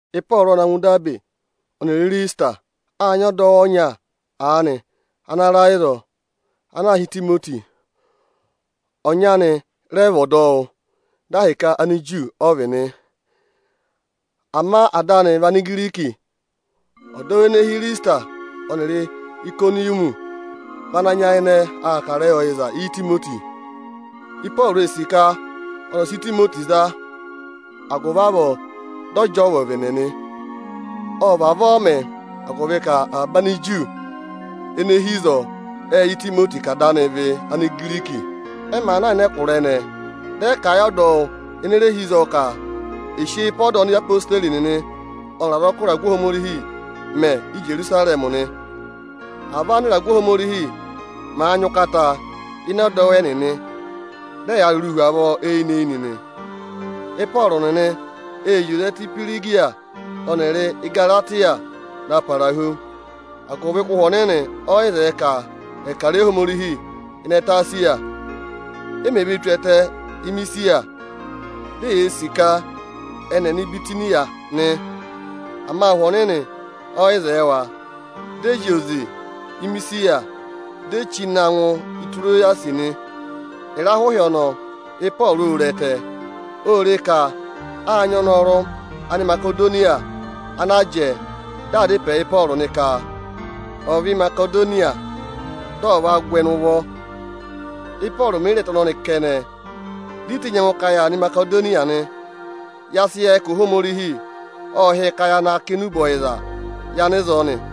Ịpọọrụ ọ na ngụ Idabe ọnịrị Ịrịsịtịra. Â nyị ọdọwụ ọnya aanị ana ra ịzọọ, ana aā hị́ Itimoti. Ọnyị anị ọnị rẹ vị ọdọwụ, dị ahịka Aniju ọ vị nị. Ama ada anị vị Anigiriki. Ọdọwụ nịnị ene hi Ịrịsịtịra ọnịrị Ayịkọnịyọmị vị ana nyayịnẹ aa kà ịrẹyị ọyịza Itimoti. Ịpọọrụ ee sì ka ọnị ọ̀ sị Itimoti za, agụvị avọọ dị ọ jị ọọ ụvẹvẹnẹ nị. Ọ vavọọ mẹ, agụvị ka avaba Aniju ene hi ịzọọ ệ yẹ Itimoti ka ada anị vị Anigiriki. Ẹ màa na ịnị ẹkụra ẹnẹẹ, dị ẹ kà a yị ọdọwụ ene re hi ịzọọ ka è sị eyi pe ọda ana odeyi nịnị ọnịrị azọkụ ịragụ Ohomorihi mẹ Íjerusarẹmị nị. Avọọ ánịragụ Ohomorihi màa nyị ụkata ịnị ẹdọwụ ẹnịnị; dị ẹyaa rụrụụ hu avọọ eyinị-eyinị nị. Ịpọọrụ nịnị ệ zị oze ẹtẹ Ihwirigiya ọnịrị Ịgaratịya na para hu, agụvị ka Ụhwẹ Ọnịnị ọ yị zẹẹ ka ẹ̀ kà ịrẹyị Ohomorihi ịnị ẹtẹ Esiya. E mèe vee tù ẹtẹ Imisiya, di eyee sì ka ẹnị ẹ̀ nọ Ibitiniya nị. Ama Ụhwẹ Ọnịnị ọ yị zẹẹ wa. Dị ẹ zị oze Imisiya, di e chí na ngụ Itirowasị nị. Ịrahụ ịhị ọnọọ, Ịpọọrụ ô re ẹtẹ. Ô re ka â nyị ọnọrụ Animasedoniya ana jẹẹ dị aa dá ịpẹẹ yị ọnị ka, ọnị ọ̀ vẹ Imasedoniya, dị ọnị ọ̀ va gụ ẹnị ụvọ. Ị́pọọrụ mè yi re ẹtẹ ọnọnị kẹnẹ, di i tenyi ẹngụ ka yaa nọ Imasedoniya nị. Ya sị yẹ ka Ohomorihi ọ hị́ yị ka ya na kà enube ọyịza yị anịzọọ nị.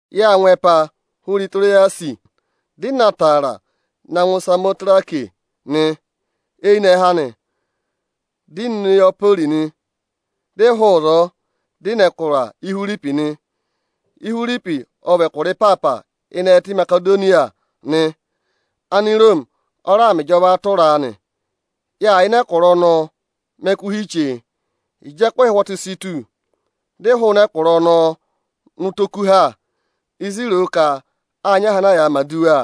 Yâ ngụ ẹpa hụrẹ Itirowasị, dị ị na taara na ngụ Isamotirake nị. Eyinẹhẹ anị, dị ị nọ Ineyapori nị. Dị ị hụụ ịzọọ, dị ị nọ ẹkụra Ihwiripi nị. Ihwiripi ọ vị ẹkụra ịpaapa ịnị ẹtẹ Imasedoniya nị. Aniroomi ọ raa mẹ ịjọvaa tụra a nị. Yâ yà ịnị ẹkụra ọnọọ mẹ ẹkụhị chee. Ịjị ẹkụhị ụhwọtụ si tù, dị ị hụụnị ẹkụra ọnọọ nọ ụtọ okuha, ịzị i ro ka â nyị aha ana a yàā mẹ̀ aduwa.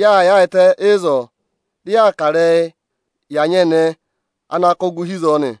Yâ yaayịtẹ ịzọọ, dị yaa kà ịrẹyị yị anyẹnẹẹ ana kụ́ gụ hi ịzọọ nị.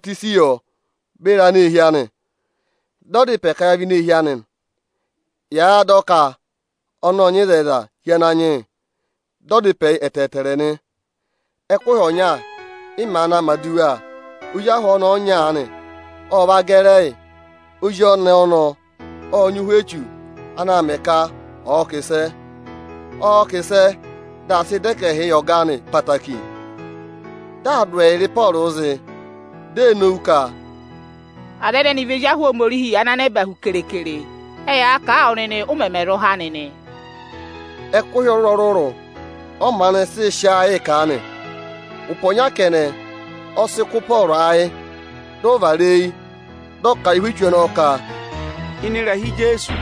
Â mẹ̀ ọyịhwọzenyi yọ beri aneehi anị. Dị ọ dá ịpẹ ka ya vẹ ini eehi anị, yàa dọ ka ọnị ộ nyị ịzẹyịza hi Ananyị yị. Dị ọ dá ịpẹ yị ẹtẹẹtẹrẹ nị. Ẹkụhị ọnya, ị màa naa mẹ̀ aduwa, ozi ahụ ọnẹẹ ọnya aanị ọ va gẹrị ẹyị. Ozi ọnẹẹ ọnọọ ộ nyị ụhwẹ echu ana aa mẹẹ ka ọ̀ọ kà ịsẹ. Ọọ̄ kà ịsẹ, dị aa sị dọ ẹkẹhịị yị ọga anị ẹtẹẹtẹrẹ. Dị aa dụ ẹyịrị Ịpọọrụ zị, di ee nowu ka, “Aza ẹnẹnị vị ezi ahụ Ohomorihi ana nẹba hu kere-kere. Ẹ yaa kà a wụ nịnị, ụ mẹmẹ zụ há nịnị.” Ẹkụhị ọrụrụ-ọrụrụ ọ maanị sị sị aa yịị kà nị. Ụpẹ ọnya kẹnẹ, ọ sị kụ́ Ịpọọrụ ayị, dị ọ vara eyi, dị ọ kà a yị ụhwẹ echu ọnọọ ka, “Ịnị ịrẹha Ijeesu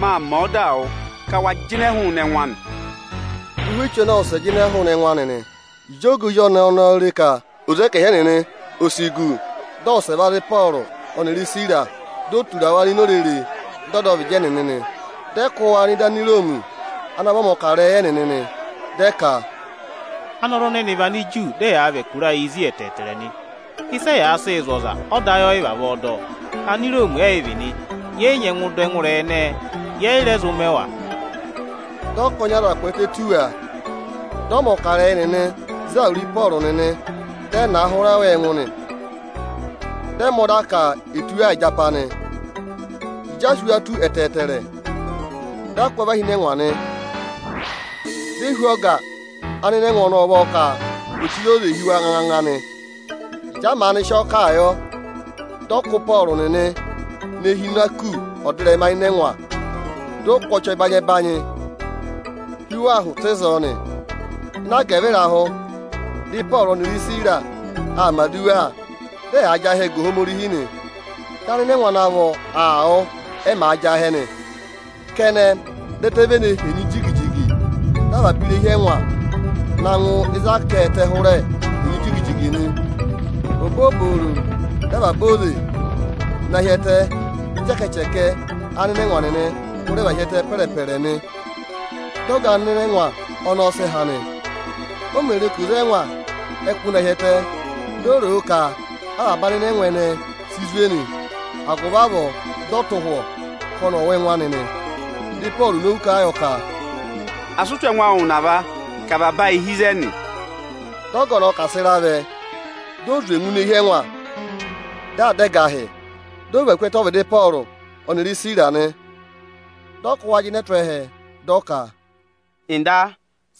mâ mẹ ọdaa wụ, ka wa jịnẹ hụụnị ẹngụ anị!” Dị ụhwẹ echu ọnọọ wụsẹ jịnẹ hụụnị ẹngụ anị nị. Ịjị ọga ozi ọnẹẹ ọnọọ re ka oze ẹkẹhị ẹnịnị o si gu, dị ẹ wụsẹ va za Ịpọọrụ ọnịrị Isira, di e tura wa nọ ini orere ịdị ọdọvịdị ẹnịnị nị. Dị ẹ kụ́ wa nọ ịdị Aniroomi ana vị ọmọkarẹyị ẹnịnị nị. Dị ẹ ka, “Anọrụ ẹnẹnị vị Aniju, dị ẹyaa và ẹkụra ayịị zí ẹtẹẹtẹrẹ nị. Ịsị ẹyaa sịị zụ̀ ọza, ọda ọ yị vavọọ dọ. Aniroomi ẹ́yị vị nị, yẹ yị nyẹngụ dọ ẹngụ ịrẹyị ẹnẹẹ, yẹ yị rẹ zụ mẹ wa.” Dị ọkọnị aza kwẹẹtẹ tù wa, dị ọmọkarẹyị nịnị za wuru Ịpọọrụ nịnị dị ẹ na a hụrẹ wa ẹngụ nị. Dị ẹ mẹ ọda ka è tụ́ wa ịjapa nị. Ịjị a sị wa tụ́ ẹtẹẹtẹrẹ, dị a kụ́ wa và hi ịnị ẹngwa nị. Di e hú ọga anịnẹngwa nịnị ị ụvọ ka ò chire oze hi wa nganganga nị. Ịjị a maanị sị ọọ kà a yọ, dị ọ kụ́ Ịpọọrụ nịnị ne hi ịnị aku ọdịrẹma ịnị ẹngwa, dị ọ kụ́ ọchị ẹbanyị-ẹbanyị hi wa ahụ tụ́ ịzọọ nị. Ịnị agẹvịrahụ, dị Ịpọọrụ ọnịrị Isira aa mẹ̀ aduwa, dị ẹyaa jị ahẹ ga Ohomorihi nị. Dị anịnẹngwa ana vọ aa wụ́, ẹ màa jị ahẹ nị. Kẹnẹ, dị ẹtẹ vene henyi jigi-jigi, dị avaba irehi ẹngwa na ngụ ịzị a kà ẹtẹ hụrẹ henyi jigi-jigi nị. Obooboro dị avaba oze na hi ẹtẹ, dị ịchẹkẹchẹkẹ anịnẹngwa nịnị hụrẹ và hi ẹtẹ pẹrẹ-pẹrẹ nị. Dị ọga anịnẹngwa ọnọọ sị ha nị. O mè re ka oze ẹngwa ẹ kụ́ na hi ẹtẹ, di o ro o ka vị́ avaba anịnẹngwa ẹnẹẹ e si zwe nị. Agụvị avọọ, dị ọ tụ̀ ụhwọ ka ọnị ọ̀ wụ ẹngụ anị nị. Dị Ịpọọrụ nowu kà a yọ ka, “Asị ụ tụ̀ ẹngụ awụ ụnava, ka avaba ayị hi ịzẹnị!” Dị ọga ọnọọ ka à sị ịra vẹ, di o zwe ngụ ini eehi ẹngwa, dị aa dá ẹgahị, dị ọ và ku ẹtẹ ọ́vịdị Ịpọọrụ ọnịrị Isira nị. Dị ọ kụ́ wa jịnẹ tụ́ ẹhẹ, dị ọ ka, “Nda,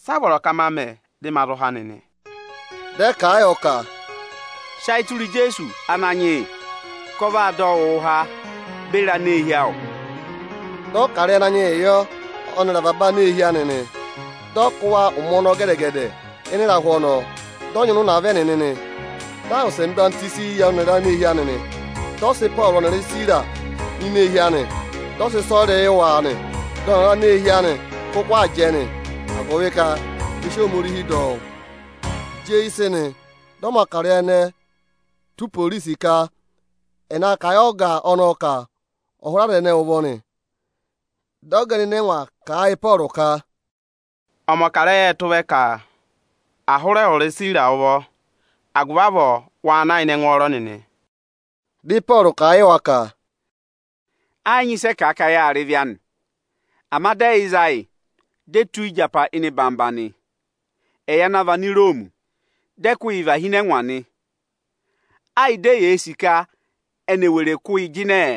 sị a vọrọ ka ma mẹ dị ma zụ há nịnị?” Dị ẹ kà a yọ ka, “Sị ayị tụra Ijeesu Ananyị yị, ka ọ vaa dọ wụụ há beri aneehi awụ!” Dị ọ kà ịrẹyị Ananyị yịị yọ ọnịrị avaba aneehi anị nị. Dị ọ kụ́ Ịpọọrụ nịnị ụmẹ ọnọọ gẹdẹ-gẹdẹ ịnị ịrahụ ọnọọ, dị ọ nyịna ụnava ẹnịnị nị. Dị a wụsẹ mẹ̀ ọyịhwọzenyi yị ọnịrị aneehi anị nị. Dị ọ sị Ịpọọrụ ọnịrị Isira nọ ini eehi anị, dị ọ sị ịsọyịrị yị wa nị. Ọnịrị aneehi anị kụkụ aa jẹ, agụvị ka ẹ sị Ohomorihi dọ wụ́. Ịjị eyi sị nị, dị ọmọkarẹyị ẹnẹẹ tụ́ iporisi ka ẹ̀ na kà a yị ọga ọnọọ ka ọ̀ hụrẹ aza ẹnẹẹ ụvọ nị. Dị ọga anịnẹngwa kà a yị Ịpọọrụ ka, “Ọmọkarẹyị ệ tụ́ vẹ ka à hụrẹ ẹwụrị Isira ụvọ. Agụvị avọọ waa na ịnị ẹngwọọrọ nịnị!” Dị Ịpọọrụ kà a yị wa ka, “Ẹ yị nyị ịsị ẹ kà a ka yâ rị ịvị anị. Ama dị ẹ yị za yị, di e tụ́ yi ịjapa ịnị orere nị, ẹyị ana vị Aniroomi. Dị ẹ kụ́ yị và hi ịnị ẹngwa nị. Á yị di eyee sì ka eni è were kụ́ yị jịnẹ!”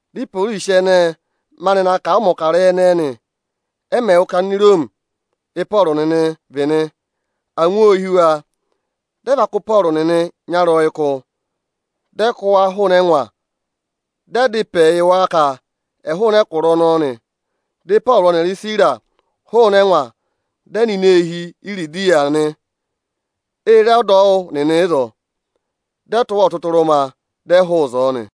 Dị iporisi ẹnẹẹ maanị na kà a yị ọmọkarẹyị ẹnẹẹ nị. Ẹ mẹ̀ wụ́ ka Aniroomi Ị́pọọrụ nịnị vị nị, angwa ô hí wa. Dị ẹ va kụ́ Ịpọọrụ nịnị nyarọyịkụ, dị ẹ kụ́ wa hụụnị ẹngwa, dị ẹ dá ịpẹ yị wa ka ẹ̀ hụụnị ẹkụra ọnọọ nị. Dị Ịpọọrụ ọnịrị Isira hụụnị ẹngwa, dị ẹ nọ ini eehi Iridiya nị. É re ọdọwụ nịnị ịzọọ, dị ẹ tụ́ wa ọtụtụrụma, dị ẹ hụụ ịzọọ nị.